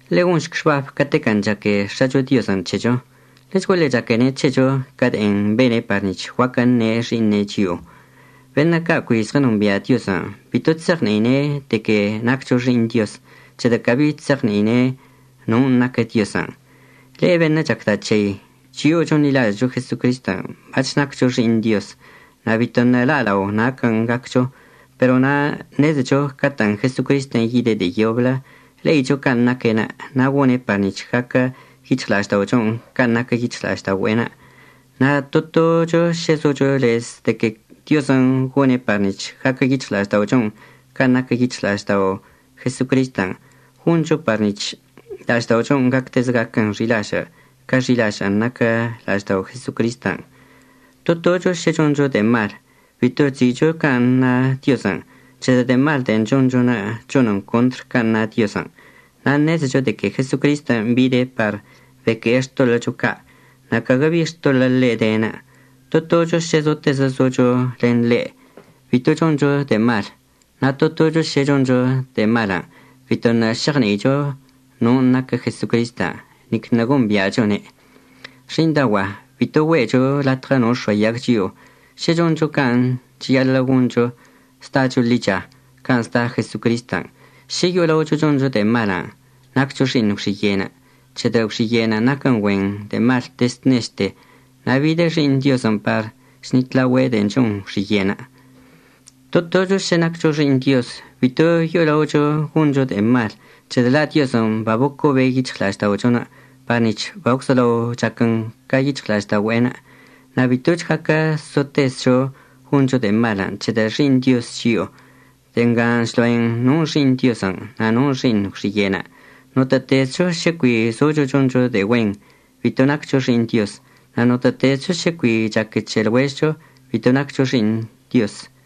Ḻe'e gonšc xbab catequən' chaque X̱acho Diozən' c̱hecho. Ḻechguaḻe chaquene' c̱hecho ca de'en bene' par nic̱h guaquə əṉe' xi'iṉe' chio'o. Beṉə' ca' cui zɉənombia' Diozən' bito chse'eɉni'ine' de que naccho xi'iṉ Dioz, c̱hedə' cabi chse'eɉni'ine' non' naquə Diozən'. Le'e beṉə' chacda' c̱hei, chio'o chonḻilažə'əcho Jesocristən' bac̱h naccho xi'iṉ Dioz. Na' bito ṉe'e la'alao naquən' gaccho, pero na' ṉezecho catə'ən Jesocristən' yide' de'e yoblə, le'icho can' naque'enə' na' gone' par nic̱h gaquə yic̱hɉla'ažda'ochon' can' naquə yic̱hɉla'aždaogüe'enə'. Na' to tocho šə zocho lez de que Diozən' gone' par nic̱h gaquə yic̱hɉla'ažda'ochon' can' naquə yic̱hɉla'aždao' Jesocristən', goncho par nic̱h la'ažda'ochon' gactezə gaquən xi'ilažə' ca xi'ilažə'ən naquə la'aždao Jesocristən'. To tocho šə choncho de'e mal bito chzi'icho can' na Diozən', c̱hedə' de'e mal de'en chonchonə' chonən contr can' na Diozən'. Na' ṉezecho de que Jesocristən' bide' par beque'e xtoḻə'əcho ca', na' caguə bi xtoḻə' ḻe' denə'. To tocho šə zotezə zocho len ḻe', bito choncho de'e mal. Na' to tocho šə choncho de'e malən', bito ṉe'e šeɉni'icho non' naquə Jesocristən', nic ṉe'e gombi'achone'. Xi'iṉdaogua'a, bito güe'echo latɉə no əx̱oayag chio'o. Šə choncho can' cheyaḻə' goncho, zdacho ḻicha can' zda Jesocristən'. Šə yo'olaocho choncho de'e malən' naccho xi'iṉ gwxiye', c̱hedə' gwxiye'enə' naquən güen de'e mal dezd nechte. Na' bidə Xi'iṉ Diozən' par chṉitlaogüe' de'en chon gwxiye'enə'. To tocho šə naccho xi'iṉ Dioz bito yo'ola'ocho goncho de'e mal, c̱hedə' la' Diozən' babocobe' yic̱hɉla'ažda'ochonə' par nic̱h bagwzolao chaquən ca yic̱hɉla'aždaogüe'enə'. Na' bitoch gaquə sotezcho goncho de'e malən' c̱hedə' xi'iṉ Dioz chio'o. De'e nga chlo'en non' xi'iṉ Diozən' na' non' xi'iṉ gwxiye'enə'. Notə'ətezcho šə cui zocho choncho de'e güen, bito naccho xi'iṉ Dioz. Na' notə'ətezcho šə cui chaque c̱he lɉuežɉcho, bito naccho xi'iṉ Dioz.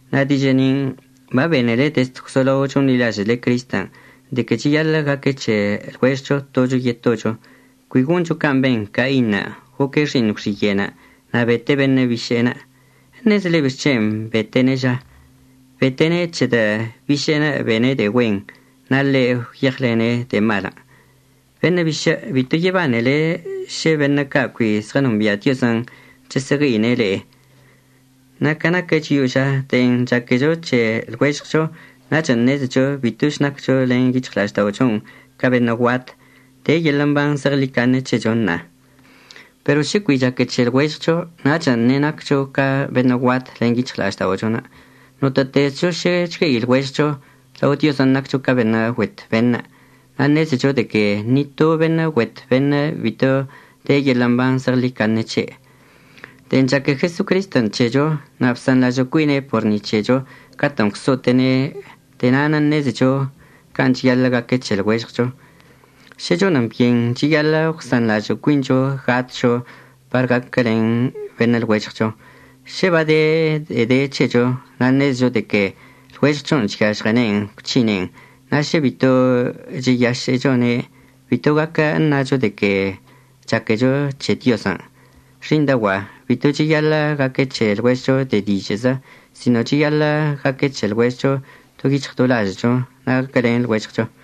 Na' dižə' nin' babenele dezd gwzolao chonḻilažə'əle Cristən', de que cheyaḻə' gaque c̱he lɉuežɉcho tocho yetocho. Cui goncho can' ben Cainṉə', goque' xi'iṉ gwxiye'enə' na' bete' beṉə' biše'enə'. ¿Eṉezele bixc̱hen' bete'ene' ža? Bete'ene' c̱hedə' biše'enə' bene' de'e güen na' ḻe' gwyeɉlene' de'e malən'. Beṉə' bišə', bito yebanele šə beṉə' ca' cui zɉənombia' Diozən' chəsə'əgue'ine' le'e. Na' ca naquə chio'o ža, de'en chaquecho c̱he lɉuežɉcho nachən' ṉezecho bitoch naccho len yic̱hɉla'ažda'ochon' ca beṉə' guat. De yeḻə' mban zeɉḻicaṉe c̱hecho ṉa'a. Pero šə cui chaque c̱he lɉuežɉcho nachən' ṉe'e naccho ca beṉə' guat len yic̱hɉla'ažda'ochonə'. Notə'ətezcho šə chgue'i lɉuežɉcho, lao Diozən' naccho beṉə' güet beṉə'. Na' ṉezecho de que ni to beṉə' güet beṉə' bito de yeḻə' mban zeɉḻicaṉe c̱he'. De'en chaque Jesocristən' c̱hecho na' bsanḻažə' cuine' por ni c̱hecho catə'ən gwso'ote'ene', de'e na'anə' ṉezecho can' cheyaḻə' gaque c̱he lɉuežɉcho. Šə chonən byen cheyaḻə' gwsanḻažə' cuincho gatcho par gaquəlen beṉə' lɉuežɉcho. Šə bade de'e de c̱hecho na' ṉezecho de que lɉuežɉchon' chyažɉene'en gwc̱hine'en, na' šə bito cheyašə'əchone', bito gaquə əṉacho de que chaquecho c̱he Diozən'. Xi'iṉdaogua'a, bito cheyaḻə' gaque c̱he lɉuežɉcho de dižə'əzə, sino cheyaḻə' gaque c̱he lɉuežɉcho do yic̱hɉ do lažə'əcho na' gaquəlen lɉuežɉcho.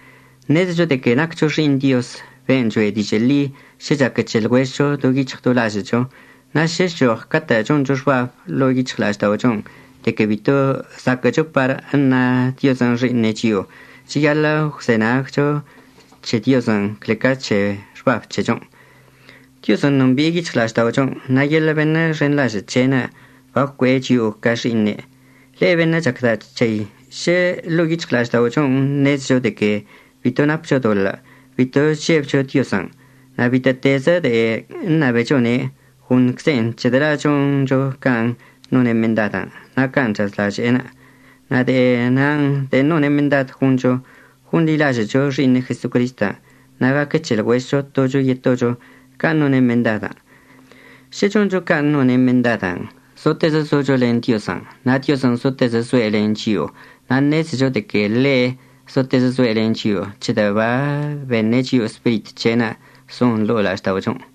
Ṉezecho de que naccho xi'iṉ Dioz ben' choe' dižə' ḻi šə chaque c̱he lɉuežɉcho do yic̱hɉ do lažə'əcho. Na' šə chchoɉ catə' choncho xbab ḻo'o yic̱hɉla'ažda'ochon' de que bito zaquə'əcho par əṉa Diozən' xi'iṉe' chio'o, cheyaḻə' əgwzenaguəchcho c̱he Diozən' cle ca c̱he xbab c̱hechon'. Diozən' nombi'e yic̱hɉla'ažda'ochon', na' yeḻə' beṉə' xenḻažə' c̱he'enə' bagwcue'e chio'o ca xi'iṉe'. Le'e beṉə' chacda' c̱hei, šə ḻo'o yic̱hɉla'ažda'ochon' ṉezecho de que bito napcho doḻə', bito chžebcho Diozən'. Na' bitə'ətezə de'e əṉabechone' goṉcze'en c̱hedə' la' choncho can' none' mendadən' na' can' chazlaže'enə'. Na' de'e nin' de'en none' mendad goncho, gonḻilažə'əcho Xi'iṉe' Jesocristən', na' gaque c̱he lɉuežɉcho tocho yetocho can' none' mendadən'. Šə choncho can' none' mendadən' zotezə zocho len Diozən' na' Diozən' zotezə zoe' len chio'o. Na' ṉezecho de que ḻe' zotezə zoe' len chio'o c̱hedə' babeṉe' chio'o Spirit c̱he'enə' zon ḻo'o la'ažda'ochon'.